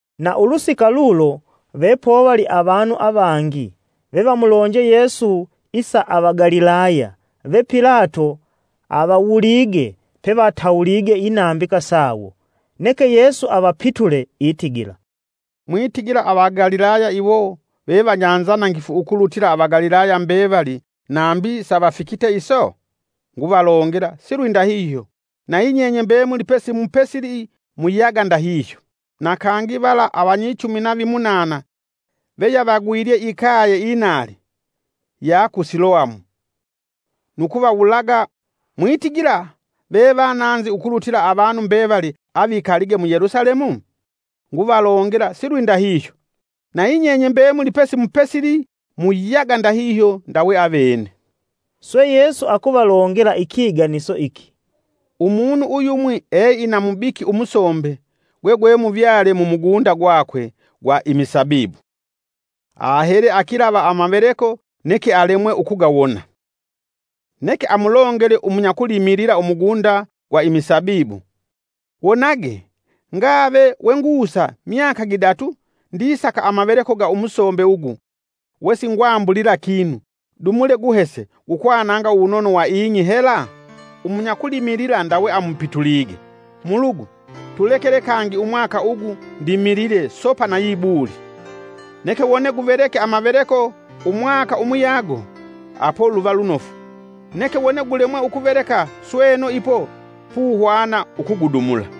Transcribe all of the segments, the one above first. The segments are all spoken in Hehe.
Na ulusika lulo vepovali avanu avangi vevamulonje Yesu isa Avagalilaya ve Pilato avawulige pevatawulige inambika sawo. Neke Yesu avapitule itigila, “Mwitigila Avagalilaya iwo ve vanyanzanangifu ukulutila Avagalilaya mbevali nambi savafikite iso? Nguvalongela silwindahihyo, nayi nyenye mbemuli pesimupesili muyaga ndahihyo. Na kangi vala avanyichumi na vimunana veyavagwilye ikaye inali, ya ku Siloamu, nu kuvawulaga mwitigila vevananzi ukulutila avanu mbevali avikalige mu Yelusalemu? Nguvalongela silwindahihyo; nayi nyenye mbemuli pesimupesili muyaga ndahihyo ndawe avene.” Swe Yesu akuvalongela ikiganiso iki. “Umunu uyumwi eina mubiki umusombe gwegwemuvyale mumugunda gwakwe gwa imisabibu. Ahele akilava amaveleko neke alemwe ukugawona. Neke amulongele umunya kulimilila umugunda gwa imisabibu: ‘Wonage! Ngave we ngusa myaka gidatu ndisaka amaveleko ga umusombe ugu we singwambulila kinu, dumule guhese gukwananga uwunono wa ing'i hela?’ Umunyakulimilila ndawe amupitulige: ‘Mulugu tulekele kangi umwaka ugu ndimilile sopa nayi buli. Neke wone guveleke amaveleko umwaka umuyago apo luva lunofu, neke wone gulemwe ukuveleka sweno ipo puhwana ukugudumula.’”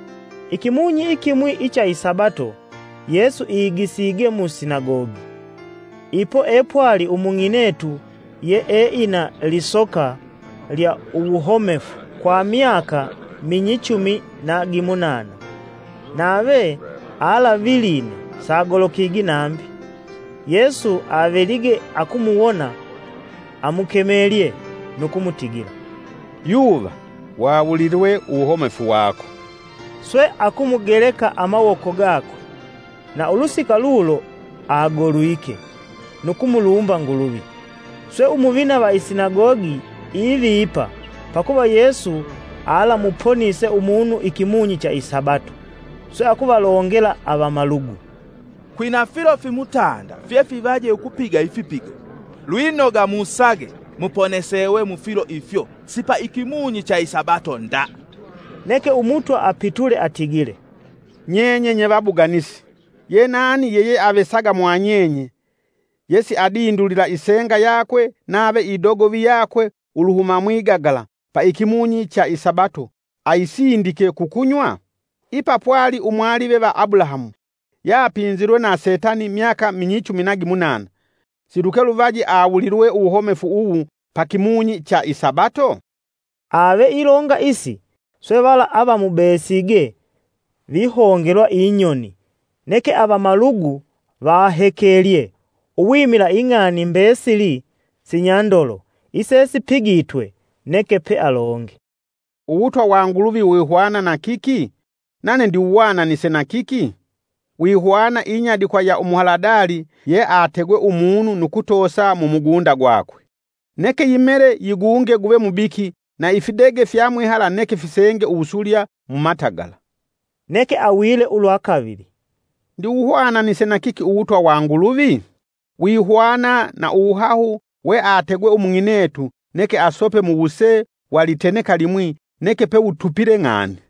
Ikimunyi ikimwi icha isabato Yesu igisige musinagogi. Ipo epwali umung'inetu ye eina lisoka lya uwuhomefu kwa myaka minyichumi na gimunana nave alaviline sagolokigi nambi. Yesu avelige akumuwona, amukemelye nu kumutigila, “Yuva, wawulilwe uwuhomefu wako.” Swe akumugeleka amawoko gakwe, na ulusika lulo agolwike nu kumulumba Nguluvi. Swe umuvina va isinagogi ivipa pakuva Yesu alamuponise umunu ikimunyi cha isabato, swe akuvalongela avamalugu, “Kwina filo fimutanda fyefivaje ukupiga ifipigo. Lwinoga musage muponesewe mufilo ifyo si pa ikimunyi cha isabato nda.” Neke Umutwa apitule atigile, “Nyenye nye vabuganisi! Ye nani yeyeavesaga mwanyenye yesiadindulila isenga yakwe nave idogovi yakwe uluhuma mwigagala pa ikimunyi cha isabato aisindike kukunywa? Ipa pwali umwalive va Abulahamu yapinzilwe na setani myaka minyichumi na gimunana, silukeluvaji awulilwe uwuhomefu uwu pa kimunyi cha isabato?” Ave ilonga isi, swe vala avamubesige vihongelwa inyoni, neke avamalugu vahekelye uwimila ing'ani mbesili sinyandolo isesipigitwe. Neke pealonge, “Uwutwa wa Nguluvi wihwana na kiki? Nane ndiwuhwananise na kiki? Wihwana inyadikwa iya umuhaladali yeategwe umunu nu kutoosa mumugunda gwakwe; neke yimele yigunge guve mubiki, na ifidege fyamwihala neke fisenge uwusulya mumatagala.” Neke awile ulwa kavili: “Ndiwuhwananise na kiki Uwutwa wa Nguluvi? Wihwana na uwuhahu weategwe umung'inetu neke asope muwuse wa liteneka limwi neke pewutupile ng'ani.”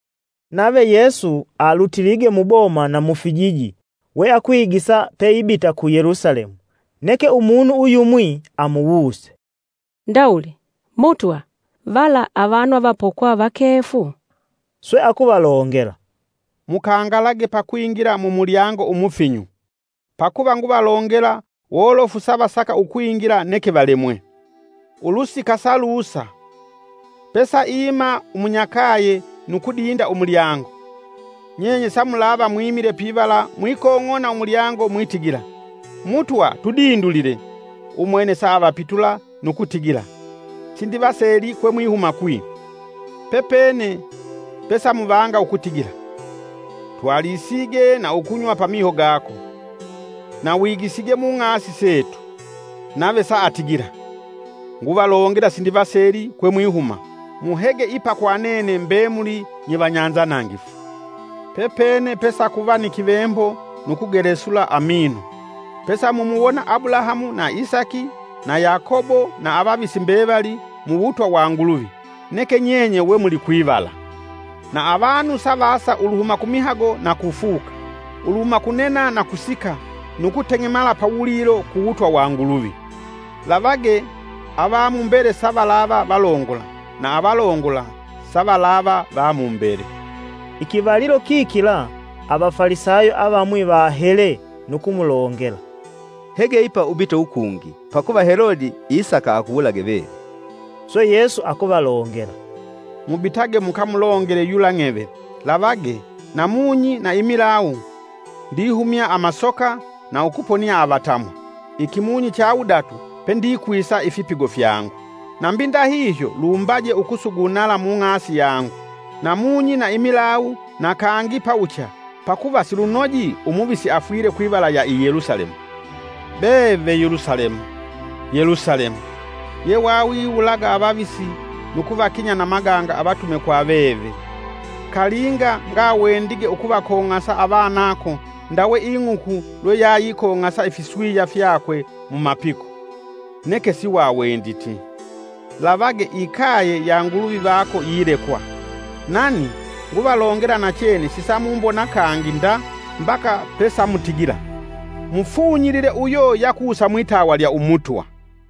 Nave Yesu alutilige muboma na mufijiji we akwigisa peibita ku Yelusalemu. Neke umunu uyumwi amuwuse, “Ndawuli, Mutwa vala avanu avapokwa vakefu?” Swe akuvalongela, “Mkangalage pakwingila mu mulyango umufinyu; pakuva nguvalongela wolofu savasaka ukwingila neke valemwe.” Ulusika salusa “Pesaima umunyakaye nu kudinda umulyango. Nyenye samulava mwimile pivala mwikong'ona umulyango mwitigila: ‘Mutwa, tudindulile.’ Umwene saavapitula nu kutigila, ‘Sindivaseli kwemwihuma kwi.’ Pepene pesamuvanga ukutigila, ‘Twalisige na ukunywa pa miho gako; na wigisige mung'asi setu.’ Nave saatigila, ‘Nguvalongela sindivaseli kwemwihuma; muhege ipa kwa nene mbemuli nye vanyanzanangifu.’ Pepene pesakuva ni kivembo nu kugelesula amino, pesamumuwona Abulahamu na Isaki na Yakobo na avavisi mbevali muwutwa wa Nguluvi, neke nyenye we mulikwivala! Na avanu savaasa uluhuma kumihago na kufuka, uluhuma kunena na kusika nu kuteng'emala pawulilo ku wutwa wa Nguluvi. Lavage avamumbele savalava valongola na avalongola savalava va mumbele.” Ikivalilo kikila Avafalisayo avamwi vahele nu kumulongela, “Hege ipa ubite ukungi, pakuva Helodi isaka akuwulage veve.” Swe Yesu akuvalongela, “Mubitage mukamulongele yula ng'eve, ‘Lavage, namunyi na imilawu ndihumya amasoka na ukuponia avatamwa, ikimunyi cha wudatu pendikwisa ifipigo fyangu.’ Nambi ndahihyo lumbaje ukusugunala mung'asi yangu, namunyi, na imilawu na kangi pawucha; pakuva silunoji umuvisi afwile kwivala ya i Yelusalemu. “Be ve Yelusalemu, Yelusalemu! Yewawiwulaga avavisi nu kuvakinya na maganga avatume kwa veve! Kalinga ngawendige ukuvakong'asa avanako, ndawe ing'uku lweyayikong'asa ifiswiya fyakwe mumapiko, neke siwawenditi. Lavage, ikaye ya Nguluvi vako yilekwa. Nani, nguvalongela nachene sisamumbona kangi nda mbaka pesamutigila: ‘Mufunyilile uyo yakusa mwitawa lya umutwa.’”